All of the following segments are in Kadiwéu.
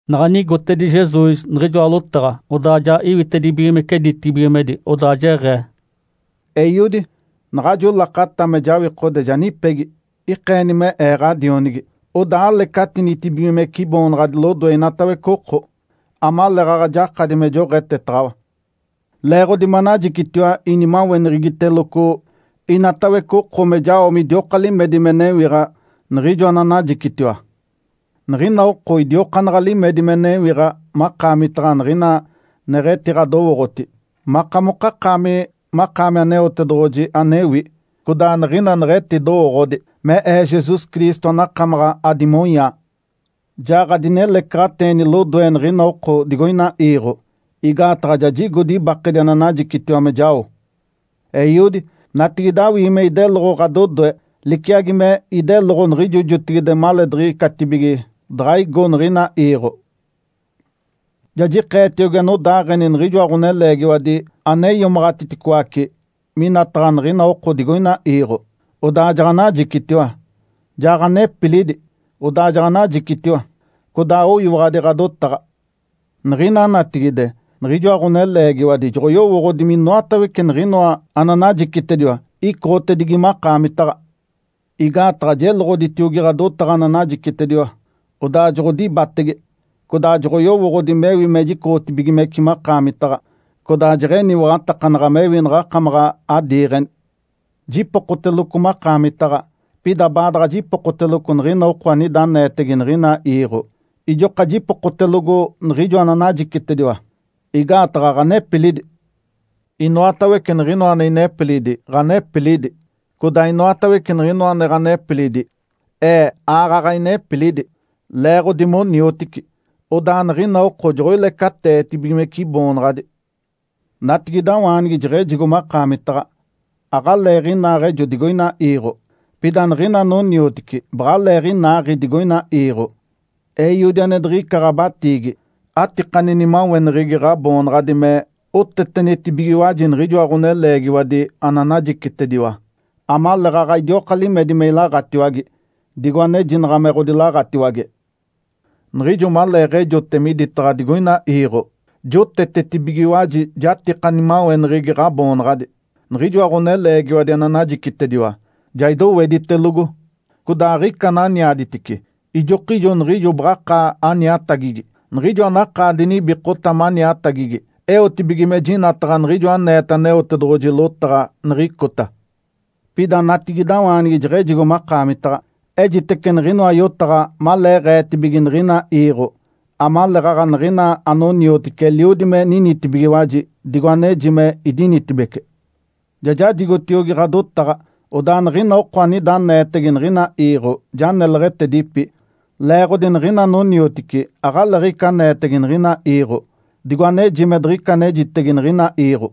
Naɡ̶a igotedi Jesus niɡ̶ijoa lotaɡ̶a, odaa ja iwitedibigimece ditibigimedi, odaa jeɡ̶ee, “Eiodi. Naɡ̶ajo lakata me jawikode ja nipegi. Ikeeni me Ee ɡ̶adionigi, odaa alecatinitibigimece Iboonaɡ̶adi lodoe inatawece oko, amaleeɡ̶aɡ̶a jakadi me joɡ̶etetaɡ̶awa. Leeɡ̶odi manajicitiwa inimaweneɡ̶egiteloco inatawece oko me jao midioka limedi me newiɡ̶a niɡ̶ijo ananajicitiwa. Niɡ̶ina oko idiokaanaɡ̶a limedi me newiɡ̶a makaamitaɡ̶a niɡ̶ina neɡ̶etiɡ̶adowooɡ̶oti, makamokakaami makaami Aneotedoɡ̶oji anewi, codaa niɡ̶ina neɡ̶etidowooɡ̶odi, me Ee, Jesus Cristo anakamaɡ̶a adimonyaa. Ja ɡ̶adinelecaɡ̶ateeni lodoe niɡ̶ina oko digoina iiɡ̶o, igaataɡ̶a ja jigodi ibakedi ananajicitiwa me jao. Eiodi, natigide awii me ideloɡ̶o ɡ̶adodoe liciagi me ideloɡ̶o niɡ̶ijo jotigide maleediɡ̶icatibige daɡ̶a igo niɡ̶ina iiɡ̶o. Ja jikeetiogi anodaaɡ̶eni niɡ̶ijoa ɡ̶oneleegiwadi ane iomaɡ̶atiticoace minataɡ̶a niɡ̶ina oko digoina iiɡ̶o, odaa jaɡ̶anajicitiwa. Ja ɡ̶anepilidi, odaa jaɡ̶anajicitiwa. Codaa oyiwaɡ̶adi ɡ̶adotaɡ̶a. Niɡ̶ina natigide niɡ̶ijoa ɡ̶oneleegiwadi joɡ̶oyowooɡ̶odi minoatawece niɡ̶inoa ananajicitediwa icoɡ̶otedigi makaamitaɡ̶a. Igaataɡ̶a jeloɡ̶oditiogi ɡ̶adotaɡ̶a ananajicitediwa, odaa joɡ̶odibatege. Codaa joɡ̶oyowooɡ̶odi mewi me jicoɡ̶otibigimece makaamitaɡ̶a, codaa jeɡ̶eniwaɡ̶atakanaɡ̶a mewi naɡ̶akamaɡ̶a adiiɡ̶eni. Jipokoteloco makaamitaɡ̶a. Pida baadaɡ̶a jipokoteloco niɡ̶ina oko anida aneetege niɡ̶ina iiɡ̶o, ijoka jipokotelogo niɡ̶ijo ananajicitediwa, igaataɡ̶a ɡ̶anepilidi. Inoatawece niɡ̶inoa ane inepilidi, ɡ̶anepilidi. Codaa inoatawece niɡ̶inoa ane ɡ̶anepilidi, Ee aaɡ̶aɡ̶a inepilidi. Leeɡ̶odi moniotici, odaa niɡ̶ina oko joɡ̶oilecateetibigimece Iboonaɡ̶adi. Natigidawaanigi jeɡ̶ejigo makaamitaɡ̶a. Aɡ̶aleeɡ̶inaaɡ̶ejo digoina iiɡ̶o. Pida niɡ̶ina anoniotici baɡ̶aleeɡ̶inaaɡ̶i digoina iiɡ̶o. Eiodi, ane diɡ̶ica ɡ̶abatiigi, atikani nimaweneɡ̶egi Ǥaboonaɡ̶adi me otetenitibigiwaji niɡ̶ijoa ɡ̶oneleegiwadi ananajicitediwa, amaleeɡ̶aɡ̶a idioka limedi me ilaɡ̶atiwage, digo anejinaɡ̶a me ɡ̶odilaɡ̶atiwage. Niɡ̶ijo maleeɡ̶ejote miditaɡ̶a digoina iiɡ̶o, jotetetibigiwaji jatika nimaweneɡ̶egi Ǥaboonaɡ̶adi. Niɡ̶ijoa ɡ̶oneleegiwadi ananajicitediwa, ja idoweditelogo. Codaa aɡ̶ica ananiaditice, ijokijo niɡ̶ijo baɡ̶akaa aniatagigi, niɡ̶ijo anakaa dinibikota maniatagigi, eotibige me jinataɡ̶a niɡ̶ijo aneeta Aneotedoɡ̶oji lotaɡ̶a niɡ̶icota. Pida natigidawaanigi jeɡ̶ejigo makaamitaɡ̶a. Ejitece niɡ̶inoa yotaɡ̶a maleeɡ̶eetibige niɡ̶ina iiɡ̶o, amaleeɡ̶aɡ̶a niɡ̶ina anoniotici eliodi me ninitibigiwaji digo aneji me idinitibeci. Ja jajigotiogi ɡ̶adotaɡ̶a. Odaa niɡ̶ina oko anida aneetege niɡ̶ina iiɡ̶o ja neleɡ̶etedipi, leeɡ̶odi niɡ̶ina anoniotici aɡ̶aleeɡ̶ica aneetege niɡ̶ina iiɡ̶o, digo aneji me diɡ̶ica anejitege niɡ̶ina iiɡ̶o.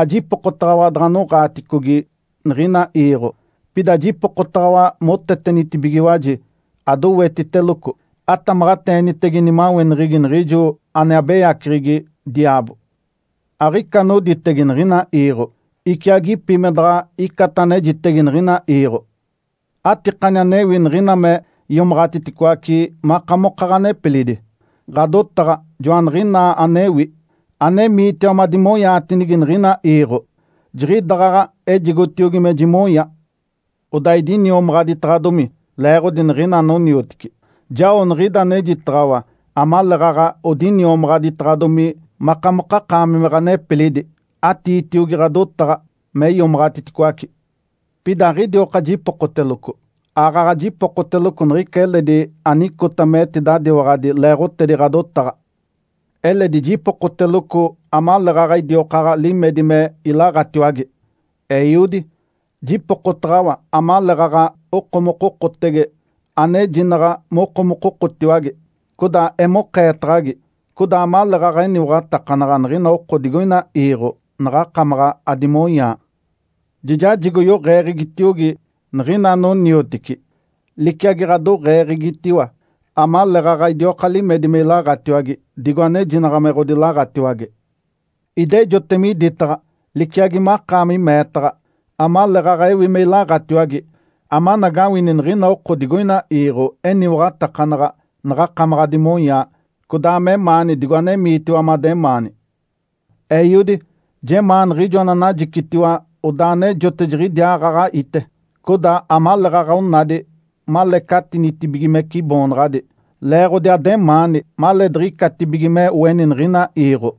Ajipokotaɡ̶awa daɡ̶anoɡ̶aaticogi niɡ̶ina iiɡ̶o, pida jipokotaɡ̶awa motetenitibigiwaji, adowetiteloco, atamaɡ̶ateenitege nimaweneɡ̶egi niɡ̶ijo ane abeyaceɡ̶egi, diaabo. Aɡ̶ica anoditege niɡ̶ina iiɡ̶o, iciagipi me daɡ̶aɡ̶a icata anejitege niɡ̶ina iiɡ̶o. Atikani anewi niɡ̶ina me iomaɡ̶atiticoace makamoka ɡ̶anepilidi. Ǥadotaɡ̶a joaniɡ̶inaa anewi. Anemiitiwa madimonyaatinigi niɡ̶ina iiɡ̶o, jiɡ̶idaɡ̶aɡ̶a ejigotiogi me jimonya. Odaa idiniomaɡ̶aditaɡ̶adomi leeɡ̶odi niɡ̶ina anoniotici. Jao niɡ̶ida anejitaɡ̶awa amaleeɡ̶aɡ̶a odiniomaɡ̶aditaɡ̶adomi makamokakaami me ɡ̶anepilidi. Atiitiogi ɡ̶adotaɡ̶a me iomaɡ̶atiticoace. Pida aɡ̶idioka jipokoteloco, aaɡ̶aɡ̶a jipokoteloco niɡ̶ica eledi anicota metidadiwaɡ̶adi leeɡ̶otedi ɡ̶adotaɡ̶a. Eledi jipokoteloco amaleeɡ̶aɡ̶a idiokaaɡ̶a limedi me ilaɡ̶atiwage. Eiodi, jipokotaɡ̶awa amaleeɡ̶aɡ̶a okomokokotege, anejinaɡ̶a mokomokotiwage, codaa emokeetaɡ̶agi, codaa amaleeɡ̶aɡ̶a eniwaɡ̶atakanaɡ̶a niɡ̶ina oko digoina iiɡ̶o naɡ̶akamaɡ̶a adimonyaa. Ja jajigo yoɡ̶eeɡ̶egitiogi niɡ̶ina anoniotici, liciagi ɡ̶adoɡ̶eeɡ̶egitiwa, amaleeɡ̶aɡ̶a idioka limedi me ilaɡ̶atiwage, digo anejinaɡ̶a me ɡ̶odilaɡ̶atiwage. Idejote miditaɡ̶a, liciagi makaami meetaɡ̶a, amaleeɡ̶aɡ̶a ewi me ilaɡ̶atiwage, amanagawini niɡ̶ina oko digoina iiɡ̶o eniwaɡ̶atakanaɡ̶a naɡ̶akamaɡ̶a adimonyaa, codaa memaani digo anemiitiwa mademaani. Eiodi. Jemaa niɡ̶ijo ananajicitiwa odaa anejote jiɡ̶idiaaɡ̶aɡ̶a ite, codaa amaleeɡ̶aɡ̶a onadi malecatinitibigimece Iboonaɡ̶adi, leeɡ̶odi ademaani maleediɡ̶icatibige me oeni niɡ̶ina iiɡ̶o.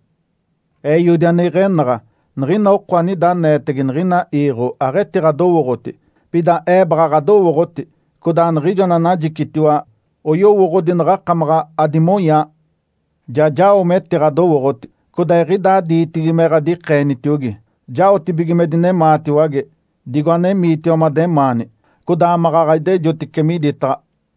Eiodi ane iɡ̶enaɡ̶a. Niɡ̶ina oko anida aneetege niɡ̶ina iiɡ̶o aɡ̶etiɡ̶adowooɡ̶oti. Pida Ee baɡ̶a ɡ̶adowooɡ̶oti codaa niɡ̶ijo ananajicitiwa oyowooɡ̶odi naɡ̶akamaɡ̶a adimonyaa. Ja jao metiɡ̶adowooɡ̶oti, codaa eɡ̶idaa diitigi me ɡ̶adikeenitiogi, jaotibige me dinemaatiwage digo anemiitiwa mademaani, codaa maɡ̶aɡ̶a idejotice miditaɡ̶a”.